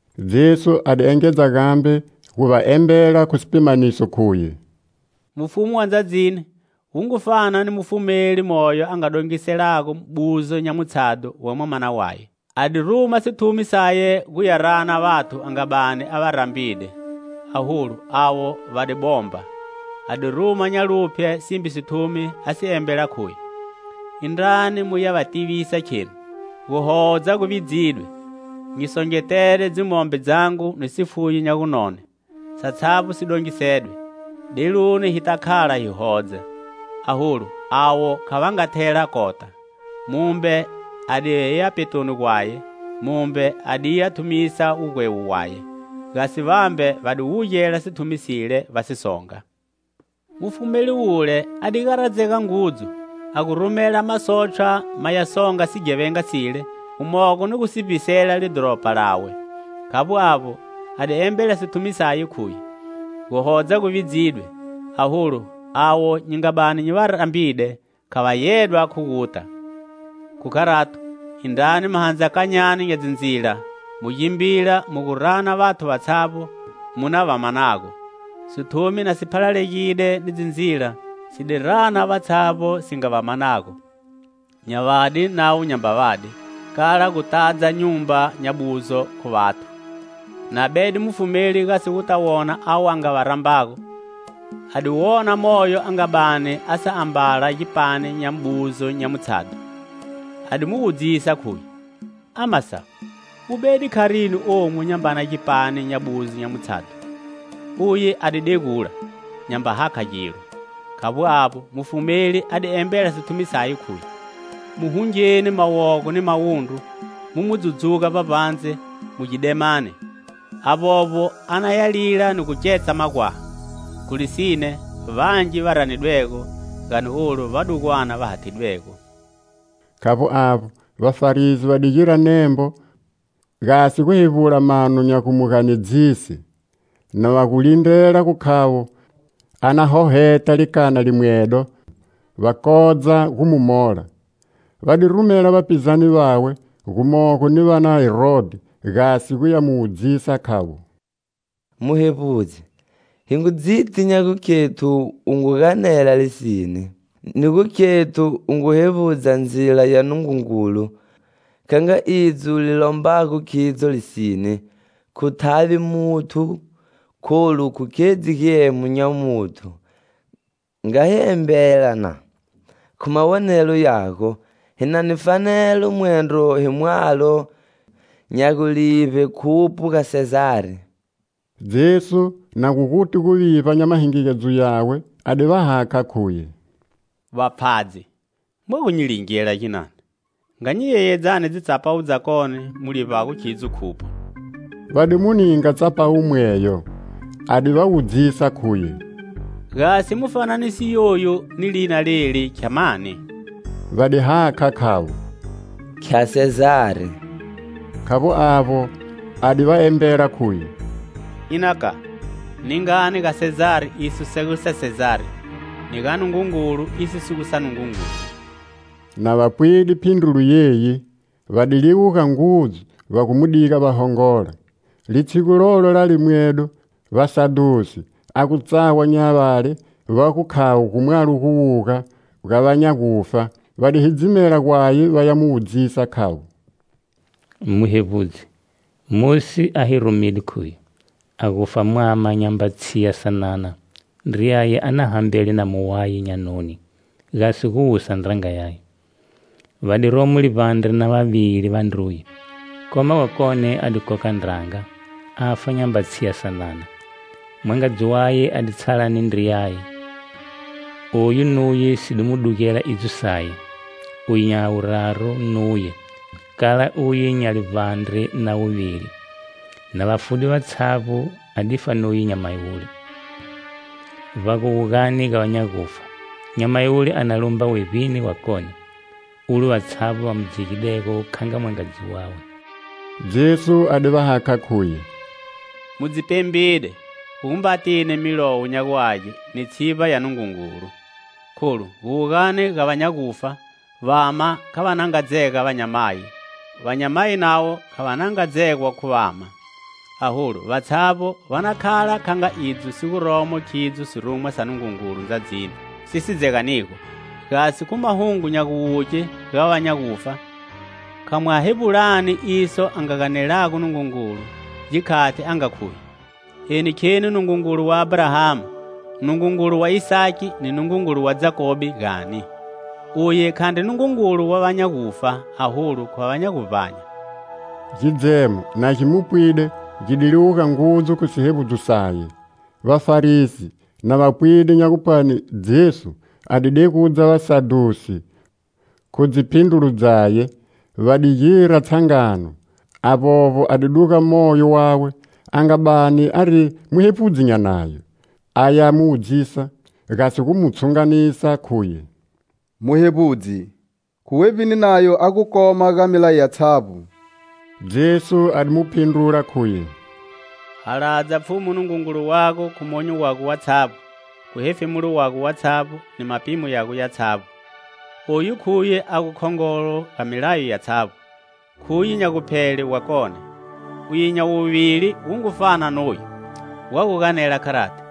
Jesu a di engedza gambe gu va embela khu sipimaniso, khuye: "Mufumu wa ndzadzini wu ngu fana ni mufumeli moyo a nga dongiselago buzo nya mutshadho wa mwamana waye. A di ruma sithumi saye guya rana vathu a nga bani a va rambide, aholu avo va di bomba. A di ruma nya luphye simbe sithumi, a si embela, khuye: 'Indrani muya va tivisa, kheno: guhodza gu vidzidwe; nyi songetede dzimombe dzangu ni sifuyo nya gunone; satshavbo si dongisedwe. Deluni hi ta khala hi hodza.' Aholu avo kha va nga thela kota. Mumbe a di ya petoni gwaye, mumbe a di ya thumisa wugwewo waye. Gasi vambe va di wugela sithumi sile, va si songa. Mufumeli wule a di garadzega ngudzu, a gu rumela masotshwa maya songa sighevenga sile, gumogo ni gu si vbisela lidhoropa lawe. Khavbo avbo, a di embela sithumi saye, khuye: 'Guhodza gu vidzidwe aholu avo nyi nga bani nyi va rambide kha va yedwa khu guta. Khu kharato, indrani mahandzakanyani nya dzindzila mu gimbila mu gu rana vathu vatshavbo mu na va manago.' Sithumi, na si phalalegide ni dzindzila, si di rana vatshavbo si nga va manago: nya vadi navo nyamba vadi, kala gu tadza nyumba nya buzo khu vathu. Na bede mufumeli gasi guta wona avo va nga rambwago, a di wona moyo a nga bani a sa ambala gipani nya buzo nya mutshadho. A di mu wudzisa, khuye: 'Ama sawu, u bede kharini omu nyambana gipani nya buzo nya mutshadho?' Uye a di degula, nyamba hakha gilo. Khavbo avbo, mufumeli a di embela sithumi saye, khuye: 'Mu hungeni mawogo ni mawundru, mu mu dzudzuga vbavbandze, mu gidemani. Avbovbo a na ya lila ni gu ketsa magwaha.' Khu lisine vangi va ranidwego gani olu vadugwana va hathidwego." Khavbo avbo, Vafarisi va di gira nembo, gasi gu hevbula mano nya gu mu ganedzise, na va gu lindrela gu khavo a na hoheta likana limwedo, va kodza gu mu mola. Va di rumela vapizane vawe, gumogo ni va na Herodhi, gasi guya mu wudzisa, khavo: "Muhevbudzi, hi ngu dziti nya gukhethu u ngu ganela lisine, ni gu khethu u ngu hevbudza ndzila ya Nungungulu kha nga idzo li lombago khidzo lisine; khu thavi muthu, kholu khu khedzi giemo nya muthu. Nga hi embela, na: Khu mawonelo yago, hi na ni fanelo mwendro hi mwalo nya gulivbe khupho ga Sezari?" Jesu, na gu guti guvivba nya mahingigedzo yawe, a di va hakha, khuye: "Vapfhadzi! Mwa gu nyi lingela ginani? Nga nyi yeyedzani dzitsapawu dzakone mu livbago khidzo khupho." Va di mu ninga tsapawu mweyo. A di va wudzisa, khuye: "Gasi mufananiso yoyu ni lina leli khya mani?" Va di hakha, khavo: "Khya Sezari." Khavbo avbo, a di va embela, khuye "Ina ka, ningani ga Sezari iso si gu sa Sezari, ni ga Nungungulu iso si gu sa Nungungulu." Na va pwide phindrulo yiyi, va di liwuga ngudzu, va gu mu diga va hongola. Litshigu lolo la limwedo, vasadhusi, a gu tsawa nya vale va gu khavo gu mwalo guwuga ga va nya gufa, va di hidzimela gwaye va ya mu wudzisa, khavo: "Muhevbudzi, Mosi a hi rumide, khuye: 'A gufa mwama nyamba tshiya sanana, ndriyaye a na hambele namu waye nya noni, gasi gu wusa ndranga yaye.' Va di romo livbandre na vavili vandruye. Koma wakone a di koka ndranga, afa nyamba tshiya sanana. Mwangadzi waye a di tshala ni ndriyaye. Oyu nuye si di mu dugela idzo saye, uye nya wuraru nuye, kala uye nya livbandre na wuvili. Na va fude vatshavbo a difa nuye nyamayi wule. Vba guwugani ga vanya gufa, nyamayi wule a na lumba wevbini wakone, ulo vatshavbo va mu dzegidego kha nga mwangadzi wawe?" Jesu a di va hakha, khuye: "Mu dzi pembide, khu gumba tini Milowo nya gu Age ni tshivba ya Nungungulu. Kholu guwugani ga va nya gufa vama kha va na nga dzega vanyamayi; vanyamayi navo kha va na nga dzegwa khu vama; aholu vatshavbo va na khala kha nga idzo si guromo khidzo sirumwa sa Nungungulu ndzadzini si si dzeganigo. Gasi khu mahungo nya guwuge ga va nya gufa, kha mwa hevbulani iso a nga ganelago Nungungulu, gikhati a nga khuye: 'Eni kheni Nungungulu wa Abrahama, Nungungulu wa Isaki ni Nungungulu wa Jakobe,' gani? Uye khandri Nungungulu wa va nya gufa, aholu, khwa va nya guvbanya!" Gidzemo, na gi mu pwide, gi di liwuga ngudzu khu sihevbudzo saye. Vafarisi, na va pwide nya gupwani Jesu a di degudza vasadhusi khu dziphindrulo dzaye, va di gira tshangano; avbovbo a di duga moyo wawe a nga bani ari muhevbudzi nya Nayo, aya mu wudzisa, gasi gu mu tshunganisa, khuye: "Muhevbudzi, khu wevbini nayo a gu koma ga milayo yatshavbo?" Jesu a di mu phindrula, khuye: " 'Haladza Pfhumu Nungungulu wago khu monyo wago watshavbo, khu hefemulo wago watshavbo ni mapimo yago yatshavbo.' Oyu khuye a gu khongolo ga milayo yatshavbo; khuye nya guphele wakone. Uye nya wuvili wu ngu fana noyu. Wa gu ganela kharati: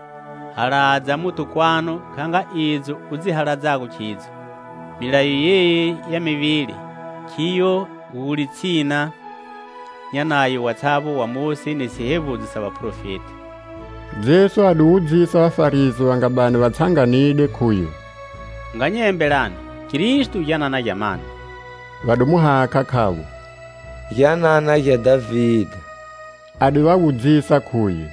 'Haladza muthu kwanu kha nga idzo u dzi haladzago khidzo.' Milayo yeyi ya mivili khiyo yi gu litshina nya Nayo watshavbo wa Mosi ni sihevbudzo sa vaprofeti." Jesu a di wudzisa Vafarisi va nga bani va tshanganide, khuye: "Nga nyi embelani: Kristo gyanana gya mani?" Va di mu hakha, khavo: "Gyanana gya Dhavide." A di va wudzisa, khuye: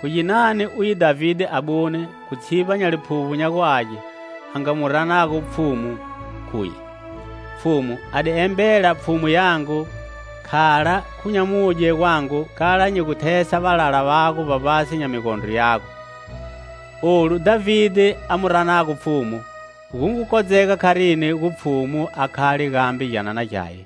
"Khu ginani uye Dhavide abune, khu tshivba nya Liphuvbo nya gu Age, a nga mu ranago Pfhumu, khuye: 'Pfhumu a di embela Pfhumu yangu, Khala khu nyamudye gwangu,kala nyi gu thesa valala vago vbavbatshi nya migondro yago?' Olu Dhavide a mu ranago Pfhumu, gu ngu kodzega kharini gu Pfhumu a khale gambe gyanana gyaye?"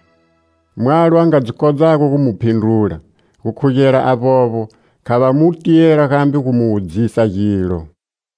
Mwalo a nga dzi kodzago gu mu phindrula. Gukhugela avbovbo kha va mu tiyela gambe gu mu wudzisa gilo.